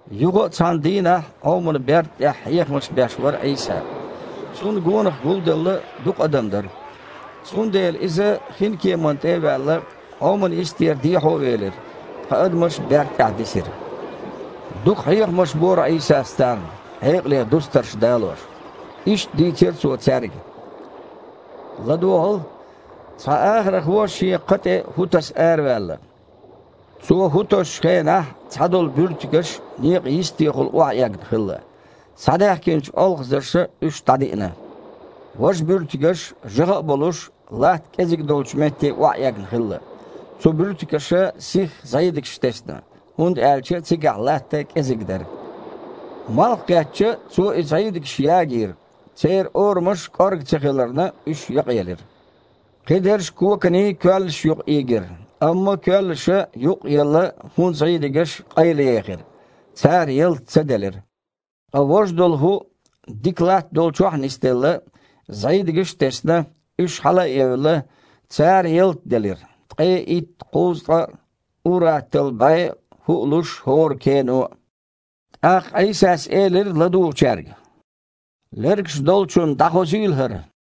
Юха а цхьана дийнахь Іоман берда тІехь хьехамаш беш вара Іийса. Цунна гонах гулделла дукха адам дара. Цундела Иза, хинкеманна тІе а ваьлла, Іоман йистера дехьо велира, ткъа адамаш берда тІехь дисира. Дукха хьехамаш бора Іийсас царна, хьекъале дустарш далош. Иштта дийцира Цо цаьрга: «ЛадогІал! Цхьа ахархо шен кха тІе хІу таса араваьлла. Цо хІу тосучу хенахь цхьадолу буьртигаш некъан йистехула охьаэгна хилла. Схьадаьхкинчу олхазарша уьш дІадиъна. Важа буьртигаш жагІа а болуш, латта кІеззиг долчу метте охьаэгна хилла. Цу буьртигаша сихха зІийдигаш тесна, хІунда аьлча цигахь латта кІезиг дара. Малх кхетча, цо и зІийдигаш ягийра, церан орамаш кІорга ца хиларна, уьш якъаелира. Кхидерш коканийн коьллаш юкъа ийгира, амма коьллаша, юкъ а елла, хІун зІийдигаш къайлаехира. Цара ялта ца делира. Ткъа важа долу хІу, дика латта долчохь нис а делла, зІийдигаш а тесна, уьш хьала а евлла, цара ялта делира, ткъе итт, кхузткъа а, ур-атталла бІе а хІу а луш хІора кено а». ТІаккха Іийсас элира ладугІучаьрга: «Лергаш долчунна дІахозийла хІара».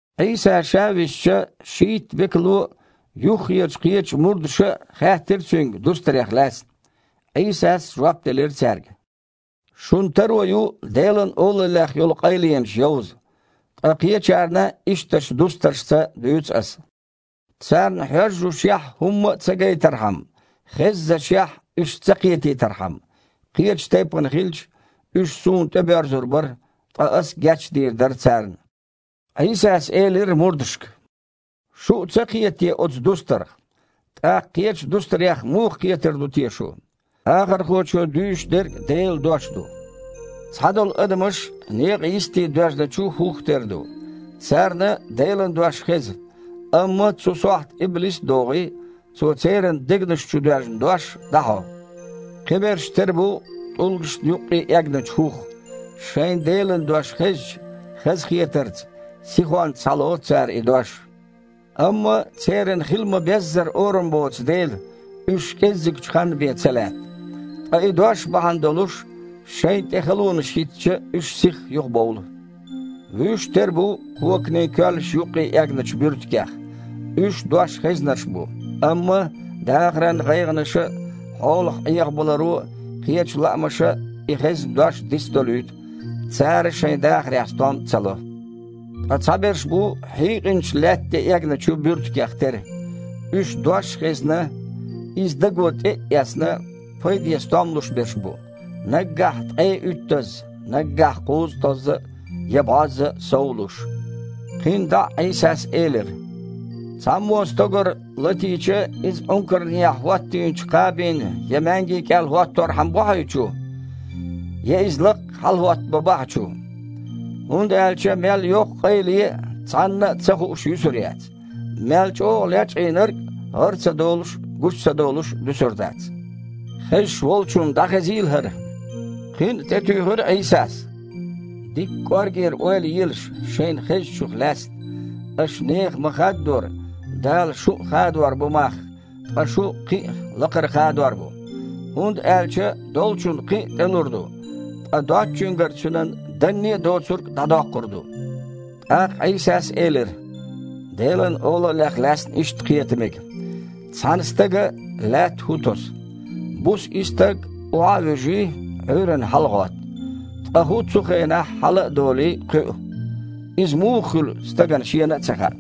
Іийса Ша висча, шийтта векало а, юххерчу кхечу мурдаша а хаьттира Цуьнга дустарех лаьцна. Іийсас жоп делира цаьрга: «Шун таро ю Делан Олаллех йолу къайленаш йовза, ткъа кхечарна ишттачу дустаршца дуьйцу Аса, „царна, хьоьжжушехь, хІумма а ца гайтархьама, хеззашехь, уьш ца кхетийтархьама, кхечу тайпана хилча, уьш Суна тІебоьрзур бара, ткъа Ас гечдийр дара царна“». Іийсас элира мурдашка: «Шу а ца кхета те оцу дустарх? ТІаккха кхечу дустарех муха кхетар ду те шу? Ахархочо дуьйш дерг Делан Дош ду. Цхьадолу адамаш некъа йисте доьжначу хІух тера ду. Царна Делан дош хеза, амма, цу сохьта иблис а догІий, цо церан дегнаш чу доьжна дош дІахьо. Кхиберш тера бу тІулгашна юккъе эгначу хІух. Шайна Делан дош хезча, хазахетарца, сихонца схьалоцу цара и дош. Амма церан хила ма-беззара орам боцу дела, уьш кІеззигчу ханна бен ца лаьтта. Ткъа и дош бахьана долуш, шайна тІе халонаш хІиттича, уьш сихха юхабовлу. Вуьш тера бу коканийн коьллаш юккъе эгначу буьртигех. Уьш дош хезнарш бу, амма дахаран гІайгІанаша а, хьолах Іехабаларо а, кхечу лаамаша а и хезна дош дицдолуьйту, цара шайн дахарехь стом а ца ло. Ткъа цхьаберш бу хьийкъинчу лаьтта тІе эгна буьртигех тера. Уьш дош а хезна, иза даго тІе а эцна, пайден стом луш берш бу – наггахь ткъе уьттазза, наггахь кхузткъазза а, я бІозза а сов луш». Кхин дІа а Іийсас элира: «Цхьаммо стогар латийча, иза Іункарнехьа хІоттийначу кхабина я маьнги кІел хІотторхьама а бохьий чу? Я иза лаккха хьалахІоттабан бахьа чу? ХІунда аьлча мел йоккха къайле а, цхьанна а ца хууш юьсур яц, мел чІогІа лечкъийнарг а гІар ца долуш а, гучу ца долуш а дуьсур дац. Хезаш волчунна дІахезийла хІара!» Кхин а тІетуьйхира Іийсас: «Дикка кІоргера ойла елаш, шайна хезначух лаьцна. Аша нехан ма-хаддора, Дала шун а хадор бу мах, ткъа шун кхин а лакхара хадор бу. ХІунда аьлча долчунна кхин а тІелур ду, ткъа доцучуьнгара цуьнан данне а доцург а дІадоккхур ву». ТІаккха Іийсас элира: «Делан Олаллех лаьцна иштта кхета мега. Цхьана стага лаьтта хІу тосу. Буса и стаг, охьа а вуьжий, Іуьйранна хьалагІотту. Ткъа хІу цу хенахь, хьала а долий, кхуьу. Иза муха хуьлу стагана шена а ца хаьа.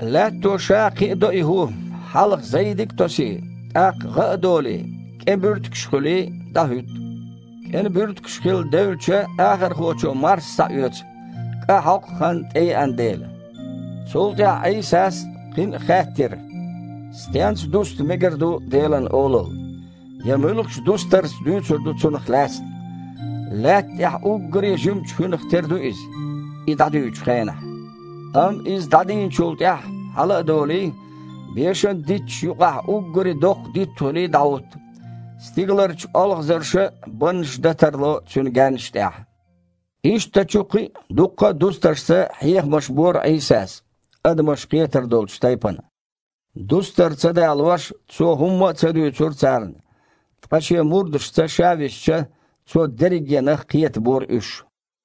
Лаьтто ша кхиадо и хІу: хьалха зІийдиг а тосий, тІаккха гІа а долий, кІен буьртигаш а хуьлий, дІахІутту. КІен буьртигаш хилла девлча, ахархочо марс схьаоьцу, кІа хьокху хан тІееана дела». Цул тІаьхьа Іийсас кхин а хаьттира: «Стенца дуста мегар ду Делан Олалла? Я муьлхачу дустарца дуьйцур ду цунах лаьцна? Лаьтта тІехь уггаре а жимачу хІуьнах тера ду иза, и дІадуьйчу хенахь. Амма иза дІадийначул тІаьхьа, хьала а долий, бешан дитташ юкъахь уггаре а доккха дитт хуьлий дІахІутту. Стигаларчу олхазарша а баннаш дан тарло цуьнан гаьннаш тІехь». Ишттачу кхин а дуккха а дустаршца хьехамаш бора Іийсас – адамаш кхетар долчу тайпана. Дустар ца далош, Цо хІумма а ца дуьйцура царна, ткъа Шен мурдашца Ша висча, Цо дерригенах кхетабора уьш.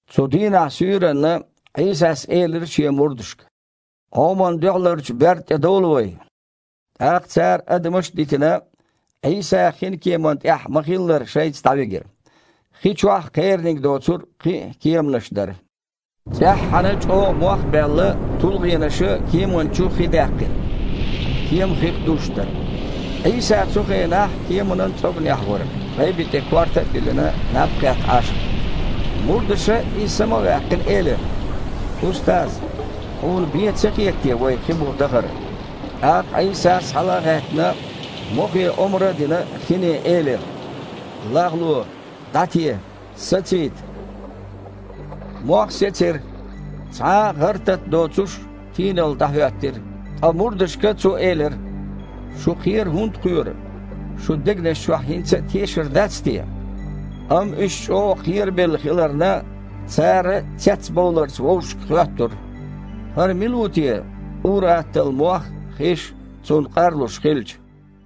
Цу дийнахь суьйранна Іийсас элира Шен мурдашка: «Іоман дуьхьалара берда тІе довла вай». ТІаккха цара адамаш а дитина, Іийса хинкеман тІехь ма-хиллара шайца дІавигира. Хи чохь кхераниг доцург кхин а кеманаш дара. ЦІеххьана, чІогІа мох а баьлла, тулгІенаша кеман чу хи даьккхира, кема хих дузуш дара. Іийса цу хенахь кеманан цІоганехь вара, гІайби тІе корта а биллина, наб кхетта Іаш. Мурдаша, Иза сама а ваьккхина, элира: «Устаз! Хьуна бен а ца хета те вай хин буха дахар?» ТІаккха Іийсас, хьала а гІаьттина, мохе омра а дина, хине элира: «ЛагІло! ДІате! Сацийта!» Мох сецира, цхьа а гІар-тата доцуш, тийналла дІахІоьттира. Ткъа мурдашка Цо элира: «Шу кхера хІунда кхоьру? Шун дегнаш чохь хІинца а тешар дац те?» Амма уьш чІогІа кхерабелла хиларна, цара цецбовларца вовшашка хоьттура: «ХІара мила ву те, ур-атталла мох а, хиш а Цунна къарлуш хилча?»